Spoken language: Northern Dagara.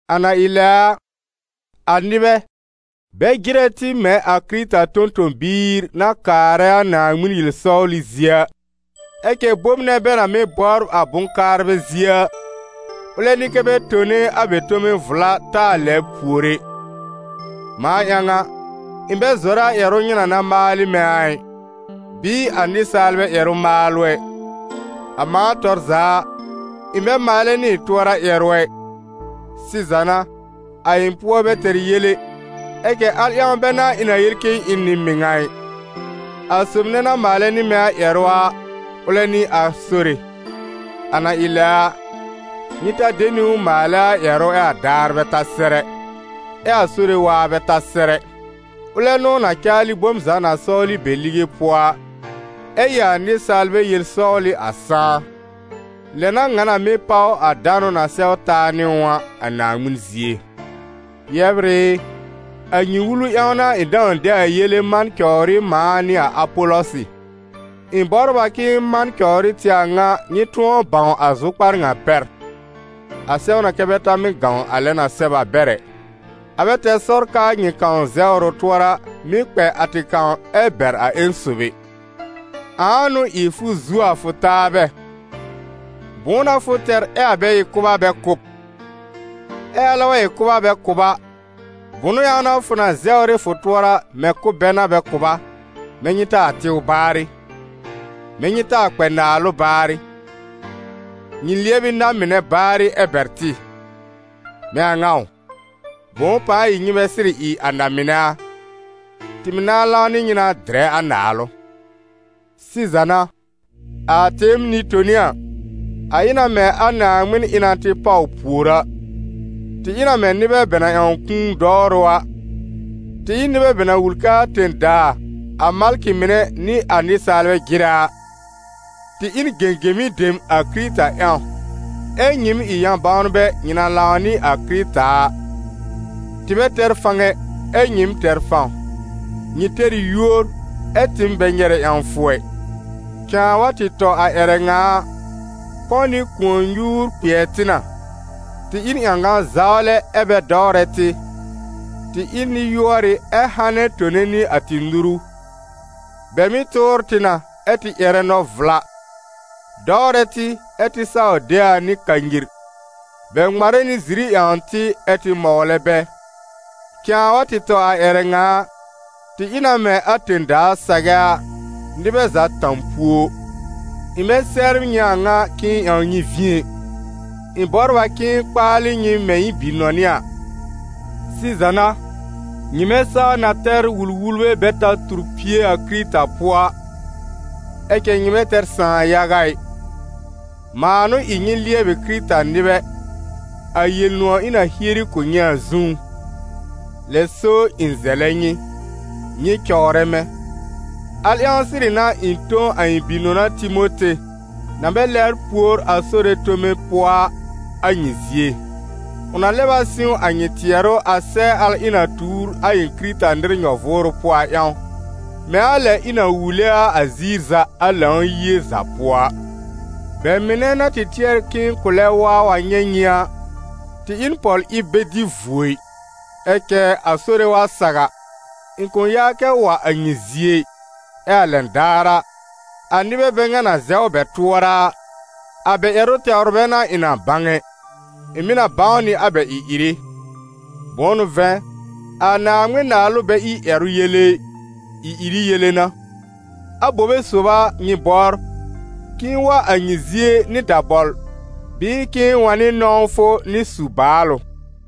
A na ɩ lɛ a, a nɩbɛ, bɛ jɩrɛ tɩ mɛ̃ a Kɩrɩta tõ-tõ-biir na kaarɛ a Naaŋmɩn yel-sɔwlɩ zie a. Ɛ cɛ bom nɛ bɛ na mɩ́ bɔbr a bʋ̃-kaarbɛ zie a, ʋlɛ n'ɩ kɛ́ bɛ tone a bɛ tome vla taa lɛbr pùor ɛ. Mãa ƴãw a, ɩ̃ bɛ zɔrɛ a ƴɛrʋ nyɩ na na maal ɩ mɛ̃ a ɩ, bɩɩ a nɩsaalbɛ ƴɛrʋ-maalʋ ɛ. A mãa tɔr za a, ɩ̃ bɛ maalɛ nɩ ɩ̃ tʋɔra ƴɛrʋ ɛ. Sɩza n'a, a ɩ̃ pʋɔ bɛ tɛr yel ɛ, ɛ cɛ al ƴãw bɛ n'a ɩ̃ na yel k'ɩ̃ɩ ɩ n nɩ-mɩŋa ɩ. A sob nɛ na maalɛ nɩ mɛ̃ a ƴɛrʋ a, ʋlɛ n'ɩ a Sore. A na ɩ lɛ a, nyɩ ta de niwn maalɛ a ƴɛrʋ ɛ a daar bɛ ta sɛr ɛ, ɛ a Sore waa bɛ ta sɛr ɛ. Ʋlɛ n'ʋ na caalɩ bom za na sɔwlɩ be lige pʋɔ a, ɛ ɩ a nɩsaalbɛ yel-sɔwlɩ a sãá. Lɛ n'a ŋa na mɩ́ páw a danʋ na sɛw taa nɩ ʋ a, a Naaŋmɩn zie. Yɛbr ɩ, a nyɩ wulu ƴãw n'a ɩ̃ dãw de a yele man cɔwr ɩ mãa nɩ a Apɔlɔsɩ. Ɩ̃ bɔbr a k'ɩ̃ɩ man cɔwr ɩ tɩ a ŋa nyɩ tʋ̃ɔ bãw a zʋkpar ŋa pɛr: «A sɛw na kɛ́ bɛ ta mɩ́ gãw a lɛ na sɛb a bɛr ɛ.» A bɛ tɛr sɔr k'aa nyɩ kãw zɛwr ʋ tʋɔra, mɩ́ kpɛ a tɩ kãw ɛ bɛr a ƴẽn sob ɛ. Ãa n'ʋ ɩ fʋ zuo a fʋ taabɛ? Bʋ̃ʋ n'a fʋ tɛr ɛ a bɛ ɩ kʋ̀b a bɛ kʋ̀ b? Ɛ alɛ wa ɩ kʋ̀b a bɛ kʋ̀ b a, bʋnʋ ƴãw n'a fʋ na zɛwr ɩ fʋ tʋɔra mɛ̃ kʋ̀b bɛ n'a bɛ kʋ̀ b a? Mɛ̃ nyɩ taa tɩw baarɩ! Mɛ̃ nyɩ taa kpɛ naalʋ baarɩ! Nyɩ lɩɛb ɩ na-mɩnɛ baarɩ ɛ bɛr tɩ! Mɛ̃ a ŋa a ʋ? Bʋ̃ʋ pãa ɩ nyɩ bɛ sɩrɩ ɩ a na-mɩnɛ a? Tɩ mɩ̀ nãa lãw nɩ nyɩ na dɩrɛ a naalʋ. Sɩza n'a, a tɩɩm nɩ-toni a, a ɩ na mɛ̃ a Naaŋmɩn ɩ na tɩ pàw pùor a. Tɩ ɩ na mɛ̃ nɩbɛ bɛ na ƴãw kũu dɔwrʋ a: tɩ ɩ n nɩbɛ bɛ na wul k'aa tẽ-daa, a malkɩ mɩnɛ nɩ a nɩsaalbɛ jɩrɛ a. Tɩ ɩ n gẽgemi dem a Kɩrɩta ƴãw, ɛ́ nyɩɩm ɩ yã-bãwnbɛ nyɩ na lãw nɩ a Kɩrɩta a; tɩ bɛ tɛr fãw ɛ, ɛ́ nyɩɩm tɛr fãw; nyɩ tɛr ɩ yúor, ɛ́ tɩɩm bɛ nyɛrɛ ƴãwfʋ ɛ. Cãa wa tɩ tɔ a ƴɛrɛ ŋa a, kɔ̃ nɩ kʋ̃ɔ-nyuur kpɩɛr tɩ na, tɩ ɩ n ƴãgã-zawlɛ ɛ́ bɛ dɔwrɛ tɩ, tɩ ɩ n nɩ-yʋɔrɩ ɛ hanɛ tone nɩ a tɩ nuru. Bɛ mɩ́ tʋʋr tɩ na, ɛ́ tɩ ƴɛrɛ nɔ-vla; dɔwrɛ tɩ, ɛ́ tɩ saw de a nɩ kanyir. Bɛ ŋmarɛ nɩ ziri ƴãwn tɩ, ɛ́ tɩ mɔwlɛ bɛ. Cãa wa tɩ tɔ a ƴɛrɛ ŋa a, tɩ ɩ na mɛ̃ a tẽ-daa sagɛ a, nɩbɛ za tã-púo. Ɩ̃ bɛ sɛbr nyɩ a ŋa k'ɩ̃ɩ ƴãw nyɩ vĩ ɛ, ɩ̃ bɔbr a k'ɩ̃ɩ kpaalɩ nyɩ mɛ̃ ɩ̃ bi-nɔnɩ a. Sɩza n'a, nyɩmɛ saa na tɛr wul-wulbɛ bɛ ta tur pie a Kɩrɩta pʋɔ a, ɛ cɛ nyɩ bɛ tɛr sãà yaga ɩ. Mãa n'ʋ ɩ nyɩ lɩɛbɩ Kɩrɩta-nɩbɛ, a Yel-nʋ̃ɔ̀ ɩ̃ na hieri kʋ̀ nyɩ a zũú. Lɛ so ɩ̃ zɛlɛ nyɩ: nyɩ cɔwrɛ mɛ̃. Al ƴãw sɩrɩ n'a ɩ̃ tõ a ɩ̃ bi-nɔna Timote, na bɛ lɛbr pùor a Sore tome pʋɔ a, a nyɩ zie; ʋ na lɛb a sɩ̃w a nyɩ tɩɛrʋ a sɛɛ al ɩ̃ na tuur a ɩ̃ Kɩrɩta-nɩr nyɔ-vʋʋrʋ pʋɔ a ƴãw, mɛ̃ a lɛ ɩ̃ na wule a a ziir za, a Lãw-yie za pʋɔ a. Bɛ mɩnɛ na tɩ tɩɛr k'ɩ̃ɩ kʋ̃ lɛb wa wa nyɛ̃ nyɩ a, tɩ ɩ n pɔl-ɩb bɛ dɩ vuo ɩ; ɛ cɛ a Sore wa saw a, ɩ̃ kʋ̃ yaa kɛ wa a nyɩ zie ɩ, ɛ a lɛn daar a, a nɩbɛ bɛ ŋa na zɛw bɛ tʋɔra a, a bɛ ƴɛrʋ tɛwr bɛ n'a ɩ̃ na bãw ɛ, ɩ̃ mɩ̀ na bãw nɩ a bɛ ɩ-ɩrɩ. Bʋ̃ʋ n'ʋ vɛ̃, a Naaŋmɩn-Naalʋ bɛ ɩ ƴɛrʋ yele ɩ, ɩ-ɩrɩ yele n'a. Abobe sob a nyɩ bɔbr: k'ɩ̃ɩ wa a nyɩ zie nɩ dabɔl bɩɩ k'ɩ̃ɩ wa nɩ nɔ̃wfʋ nɩ su-baalʋ?